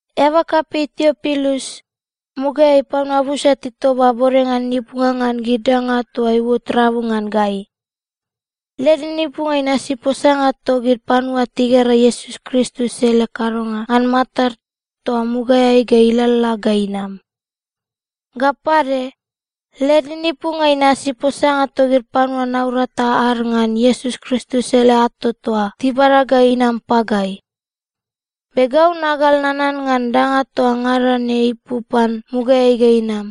Eaba kapei Tiopilus, mugaeai panua busa titoba bodenga ninipunga ngan gid danga toa iuot rabu ngan gai. Led ninipunga inasi posanga togid panua tigera Iesus Kristus ele kadonga ngan matad toa mugaeai ga ilalala ga inam. Ga pade, led ninipunga inasi posanga togid panua naurata ad ngan Iesus Kristus ele ato toa tibada ga inam pagai. Be gau nagal nanan ngan danga toa ngada ne ipu pan mugaeai ga inam.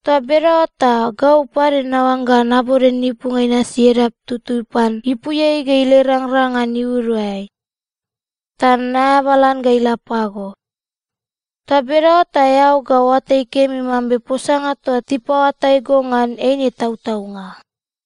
Toa bedaoa ta gau pade naoangga nabode ninipunga inasi edap tutui pan ipuiai ga ila irangrang ngan iuduai, ta naeabalan ga ila pago. Toa bedaoa ta eao ga oatai kemi mambe posanga toa tipaoatai go ngan, eine tautaunga.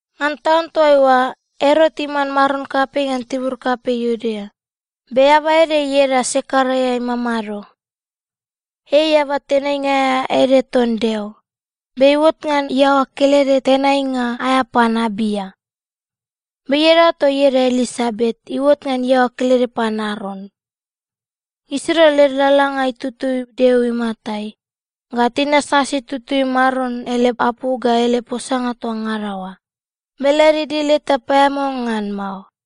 Ngan taun toaiua, Erot iman maron kapei ngan tibur kapei Iudea, be eaba ede ieda Sekaraia imamado. Ei eaba tenainga aea ede ton Deo, be iuot ngan iaoa kelede tenainga aea pan Abia. Be iadaoa toa ieda Elisabet iuot ngan iaoa kelede pan Aron. Gisirua led lalalanga itutui Deo imatai, ga tinasnasi tutui Maron ele apu ga ele posanga toa ngada oa, be led idil eta paeamao ngan mao.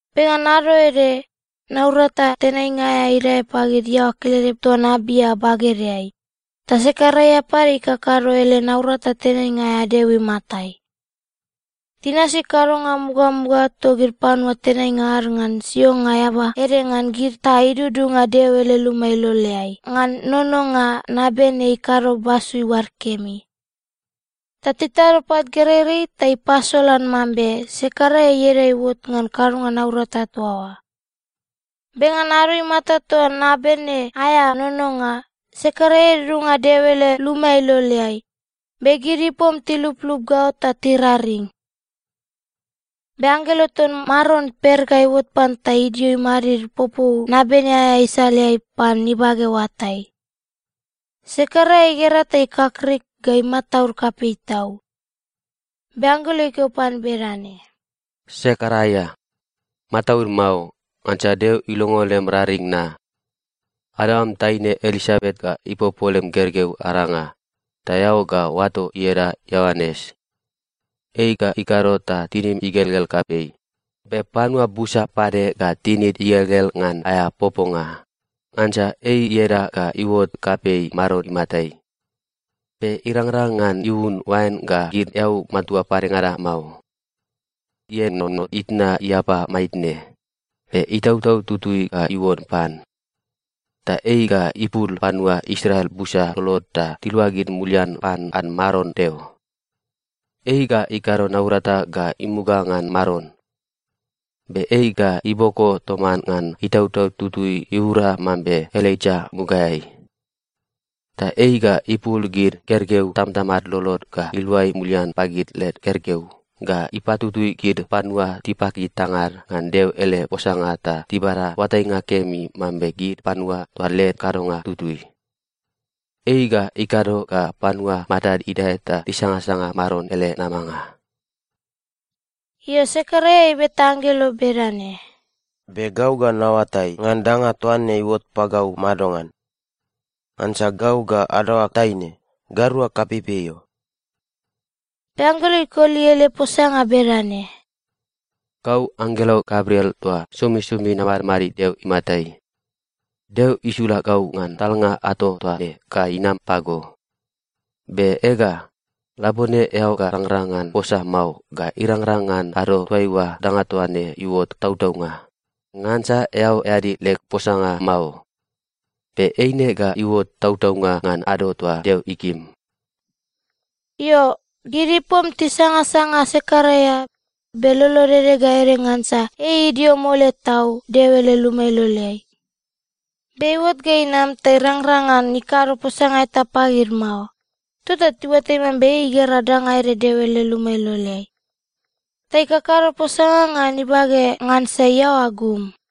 Be ngan ado ede, naurata tenainga aea idae pagid iaoa kelede ton Abia bagedeai, ta Sekaraia pade ikakado ele naurata tenainga aea Deo imatai. Tinasi kadonga mugamuga togid panua tenainga ad ngan sionga eaba ede ngan gid ta idudunga Deo ele luma iloleai ngan nononga nabene ikado basu iuad kemi. Ta titado pat gereirei ta ipasolan mambe Sekaraia ieda iuot ngan kadonga naurata toa oa. Be ngan ado imata toa nabene aea nononga, Sekaraia idudunga Deo ele luma iloleai, be gid ipom tiluplup gaot ta tiraring. Be anggelo ton Maron per ga iuot pan ta idio imadid popou nabene aea isaleai pan ibage oatai. Sekaraia igera ta ikakrik ga imataud kapei tau. Be anggelo ikeo pan bedane, “Sekaraia, mataud mao, ngansa Deo ilongo lem raring na. Adaoam taine Elisabet ga ipopo lem gergeu aranga, ta eao ga oato ieda Ioanes. Ei ga ikado ta tinim igelgel kapei, be panua busa pade ga tinid igelgel ngan aea poponga, ngansa ei ieda ga iuot kapei Maron imatai. Be irangrang ngan iun oain ga gid eau matua padengada mao. Ienono itna iapai maitne, be Itautau Tutui ga iuon pan. Ta ei ga ipul panua Israel busa lolod ta tiluagid mulian pan ad Maron Deo. Ei ga ikado naurata ga imuga ngan Maron. Be ei ga iboko toman ngan Itautau Tutui iura mambe Elaija mugaeai. Ta ei ga ipul gid gergeu tamatamad lolod ga iluai mulian pagid led gergeu, ga ipatutui gid panua tipaki tangad ngan Deo ele posanga ta tibada oatainga kemi mambe gid panua toa led kadonga tutui. Ei ga ikado ga panua matad idae ta tisangasanga Maron ele namanga.” Io, Sekaraia ibeta anggelo bedane, “Be gau ga naoatai ngan danga toa ne iuot pagau madongan? Ngansa gau ga adaoag taine, gairua kapeipei o.” Be anggelo ikoli ele posanga bedane, “Gau anggelo Gabriel toa somisomi namadmadid Deo imatai. Deo isula gau ngan talnga ato toa ne ga inam pago. Be ega, labone eao ga rangrang ngan posa mao ga irangrang ngan ado toaiua danga toa ne iuot tautaunga, ngansa eao eadi leg posanga mao. Be eine ga iuot tautaunga ngan ado toa Deo ikim.” Io, gid ipom tisangasanga Sekaraia, be lolod ede ga ede ngansa ei idio mole tau Deo ele luma iloleai. Be iuot ga inam, ta irangrang ngan ikado posanga eta pagid mao. Tota tiuatai mambe ei igera danga ede Deo ele luma iloleai. Ta ikakado posanga ngan ibage ngansa iaoa gum.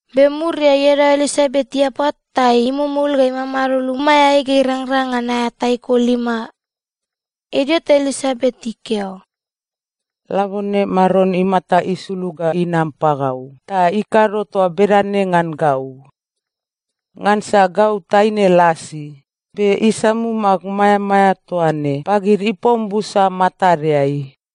Be muriai, iadaoa Elisabet iapa ta imumul ga imamado lumaeai ga irangrang ngan aea taiko lima. Idio ta Elisabet ikeo, “Labone Maron imata isulug ga inam pagau ta ikado toa bedane ngan gau. Ngansa gau taine lasi, be isamum ag maeamaea toa ne pagid ipom busa matadeai.”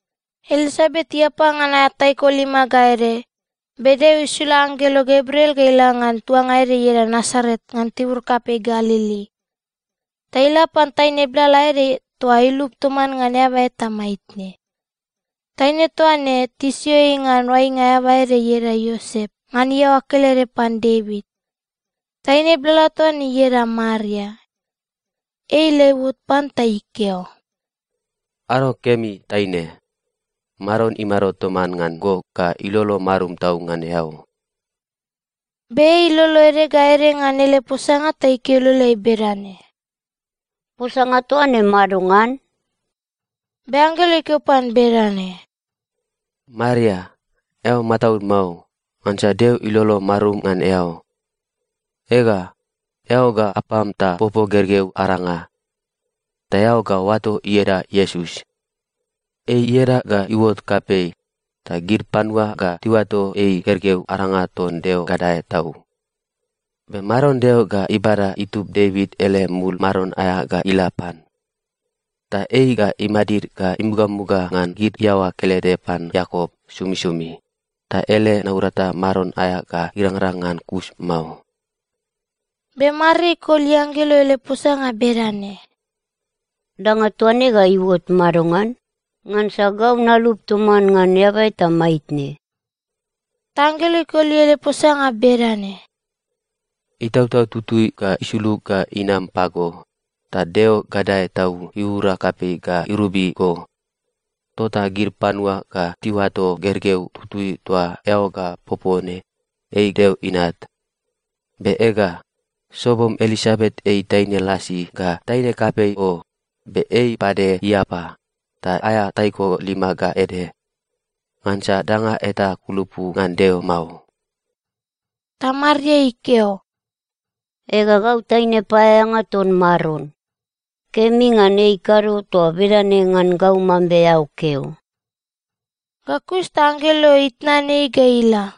Elisabet iapa ngan aea taiko lima ga ede, be Deo isula anggelo Gabriel ga ila ngan tuanga ede ieda Nasaret ngan tibur kapei Galili. Ta ila pan taine blala ede toa ilup toman ngan eaba eta maitne. Taine toa ne, tisio ei ngan oainga eaba ede ieda Iosep ngan iaoa kelede pan Devit. Taine blala toa ne ieda Maria. Ei ila iuot pan ta ikeo, “Ado kemi, taine. Maron imado toman ngan go ga ilolo marum tau ngan eao.” Be ei ilolo ede ga ede ngan ele posanga ta ikeo iloleai bedane, “Posanga toa ne madongan?” Be anggelo ikeo pan bedane, “Maria, eao mataud mao. Ngansa Deo ilolo marum ngan eao. Ega, eao ga apam ta popo gergeu aranga, ta eao ga oato ieda Iesus. Ei ieda ga iuot kapei, ta gid panua ga tiuato ei gergeu aranga ton Deo Gadae Tau. Be Maron Deo ga ibada itub Devit ele mul maron aea ga ila pan. Ta ei ga imadid ga imugamuga ngan gid iaoa kelede pan Iakop somisomi, ta ele naurata maron aea ga irangrang ngan kus mao.” Be Maria ikoli anggelo ele posanga bedane, “Danga toa ne ga iuot madongan? Ngansa gau nalup toman ngan eaba eta maitne.” Ta anggelo ikoli ele posanga bedane, “Itautau Tutui ga isulug ga inam pago, ta Deo Gadae Tau iura kapei ga irobi go. Tota gid panua ga tiuato gergeu tutui toa eao ga popo ne ei Deo Inat. Be ega, sobom Elisabet ei taine lasi ga taine kapei o, be ei pade iapa, ta aea taiko lima ga ede. Ngansa danga eta ikulupu ngan Deo mao.” Ta Maria ikeo, “Ega, gau taine paeaeanga ton Maron. Kemi ngan ikado toa bedane ngan gau mambe eao keo.” Ga kus ta anggelo itnan ei ga ila.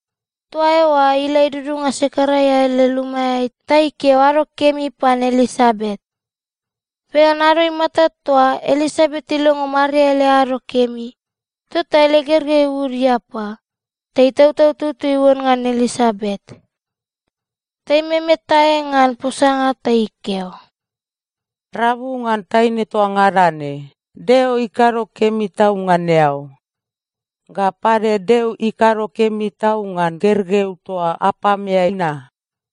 Toa eoa ila idudunga Sekaraia ele lumaeai ta ikeo “ado kemi” pan Elisabet. Be ngan ado imata toa Elisabet ilongo Maria ele ado kemi, tota ele gergeu iud iapa, ta Itautau Tutui iuon ngan Elisabet. Ta imemetae ngan posanga ta ikeo, “Rabu ngan taine toa ngada ne, Deo ikado kemi tau ngan eao! Ga pade, Deo ikado kemi tau ngan gergeu toa apameai na.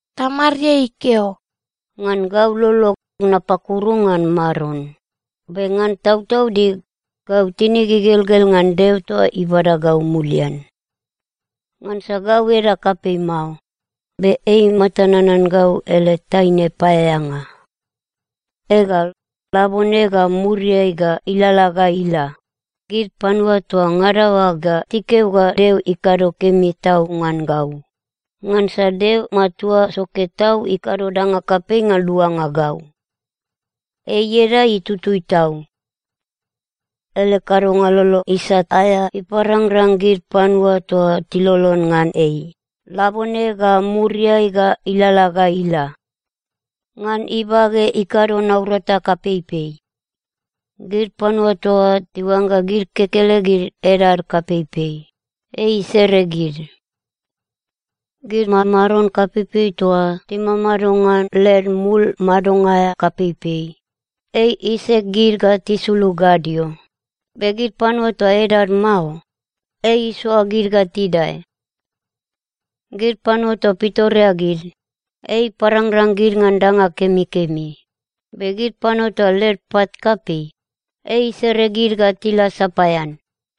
Ta Maria ikeo, “Ngan gau lolog, napakuru ngan Maron, be ngan tautaudig, gau tinig igelgel ngan Deo toa ibada gau mulian. Ngansa gau edag kapei mao, be ei imata nanan gau ele taine paeaeanga. Ega, labone ga muriai ga ilalala ga ila, gid panua toa ngada oa ga tikeo ga Deo ikado kemi tau ngan gau, ngansa Deo matua soke tau ikado danga kapei ngan luanga gau. Ei ieda itutui tau. Ele kadonga lolo isat aea iparangrang gid panua toa tilolon ngan ei, labone ga muriai ga ilalala ga ila. Ngan ibage, ikado naurata kapeipei. Gid panua toa tiuangga gid kekelegid edad kapeipei, ei isere gid. Gid mamaron kapeipei toa timamado ngan led mul madonga aea kapeipei, ei isek gid ga tisulug gadio, be gid panua toa edad mao, ei isoa gid ga tidae. Gid panua toa pitoreagid, ei iparangrang gid ngan danga kemikemi, be gid panua toa led pat kapei, ei isere gid ga tila sapaean.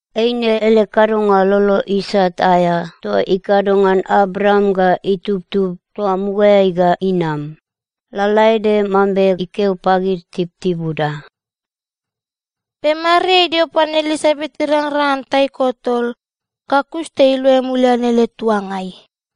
Eine ele kadonga lolo isat aea toa ikado ngan Abraam ga itubtub toa mugaeai ga inam, lalaede mambe ikeo pagid tibutibuda.” Be Maria idio pan Elisabet irangrang ngan taiko tol, ga kus ta iluai mulian ele tuangai.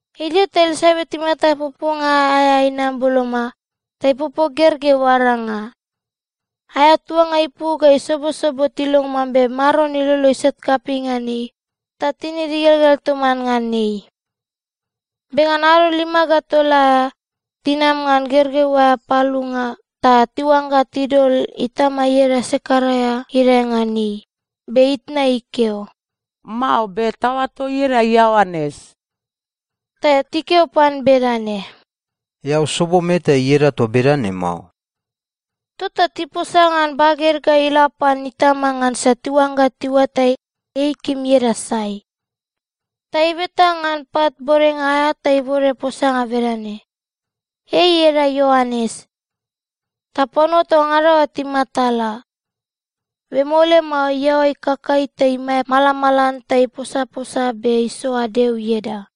Idio ta Elisabet imata poponga aea inam boloma, ta ipopo gergeu aranga. Aea tuanga ipu ga isobosobo tilongo mambe Maron ilolo isat kapei ngan ei, ta tinid igelgel toman ngan ei. Be ngan ado lima ga tol aea, tinam ngan gergeu aea palunga ta tiuangga tidol itama ieda Sekaraia idae ngan ei. Be itna ikeo, “Mao, be taoato ieda Ioanes.” Ta tikeo pan bedane, “Eao sobom eta ieda toa bedana mao.” Tota tiposa ngan baged ga ila pan itama ngansa tiuangga tiuatai, ei ikim ieda sai. Ta ibeta ngan pat bodenga aea ta ibode posanga bedane, “Ei ieda Ioanes.” Ta panua toa ngada oa timatala. Be mole mao, iaoa ikakai ta imae imalamalan ta iposaposa be isoa Deo ieda.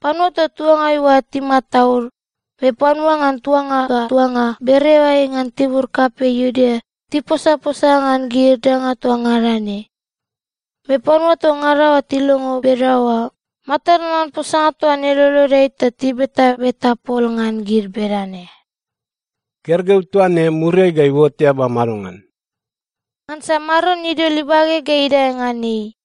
Panua toa tuangai oa timataud, be panua ngan tuanga ga tuanga bereoeai ngan tibur kapei Iudea tiposaposa ngan gid danga toa ngada ne. Be panua toa ngada oa tilongo bedaoa, matad nanan posanga toa ne lolodeai ta tibetabeta pol ngan gid bedane, “Gergeu toa ne, muriai ga iuot eaba madongan?” Ngansa Maron idol ibage ga idae ngan ei.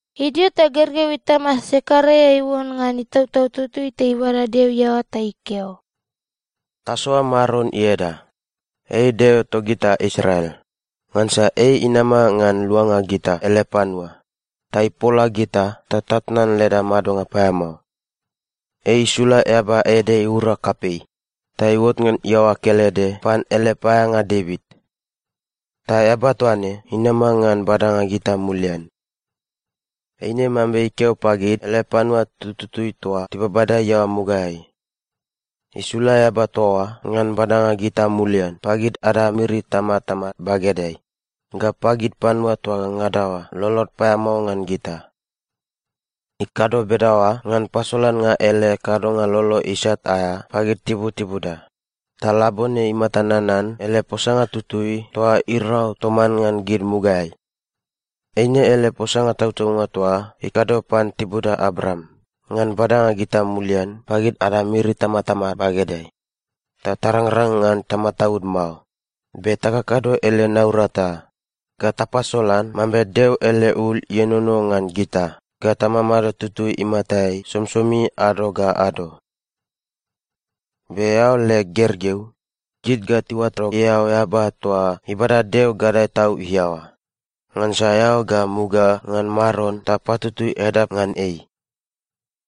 Idio ta gergeu itama Sekaraia iuon ngan Itautau Tutui ta ibada Deo iaoa ta ikeo, “Tasoa Maron ieda, ei Deo togita Israel, ngansa ei inama ngan luanga gita ele panua, ta ipola gita ta tatnan leda madonga paeamao. Ei isula eaba ede iura kapei, ta iuot ngan iaoa kelede pan ele paeaeanga Devit. Ta eaba toa ne inama ngan badanga gita mulian. Eine mambe ikeo pagid ele panua tututui toa tibabada iaoa mugaeai. Isula eaba toa oa ngan badanga gita mulian pagid ada miri itamatama bagedeai ga pagid panua toa ngada oa lolod paeamao ngan gita. Ikado bedaoa ngan pasolannga ele kadonga lolo isat aea pagid tibutibuda, ta labone imata nanan ele posanga tutui toa irau toman ngan gid mugaeai. Eine ele posanga tautaunga toa ikado pan tibuda Abraam ngan badanga gita mulian pagid ada miri itamatama bagedeai, ta tarangrang ngan tamataud mao, be takakado ele naurata ga tapasolan mambe Deo ele ul ienono ngan gita ga tamamado tutui imatai somisomi ado ga ado. “Be eao leg gergeu, gid ga tiuato eao eaba toa ibada Deo Gadae Tau iaoa, ngansa eao ga muga ngan Maron ta patutui edap ngan ei.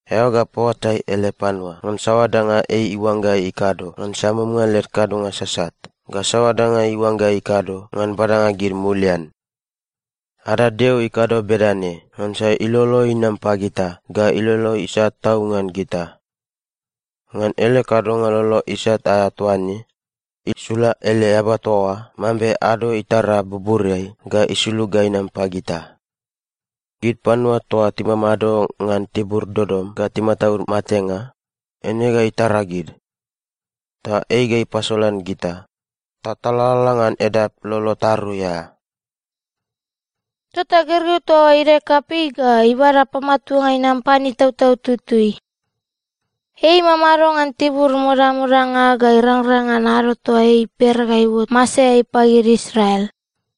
Eao ga paoatai ele panua ngan saoa danga ei iuangga ikado ngan samumnga led kadonga sasat ga saoa danga iuangga ikado ngan badanga gid mulian. Ada Deo ikado bedane ngansa ilolo inam pagita ga ilolo isat tau ngan gita. Ngan ele kadonga lolo isat aea toa ne, isula ele eaba toa oa mambe ado itara buburiai ga isulug ga inam pagita. Gid panua toa timamado ngan tibur dodom ga timataud matenga, eine ga itara gid. Ta ei ga ipasolan gita ta talalala ngan edap lolo tarui aea.” Tota gergeu toa oa idae kapei ga ibada pamatuanga inam pan Itautau Tutui. Ei imamado ngan tibur modamodanga ga irangrang ngan ado toa ei per ga iuot masaeai pagid Israel.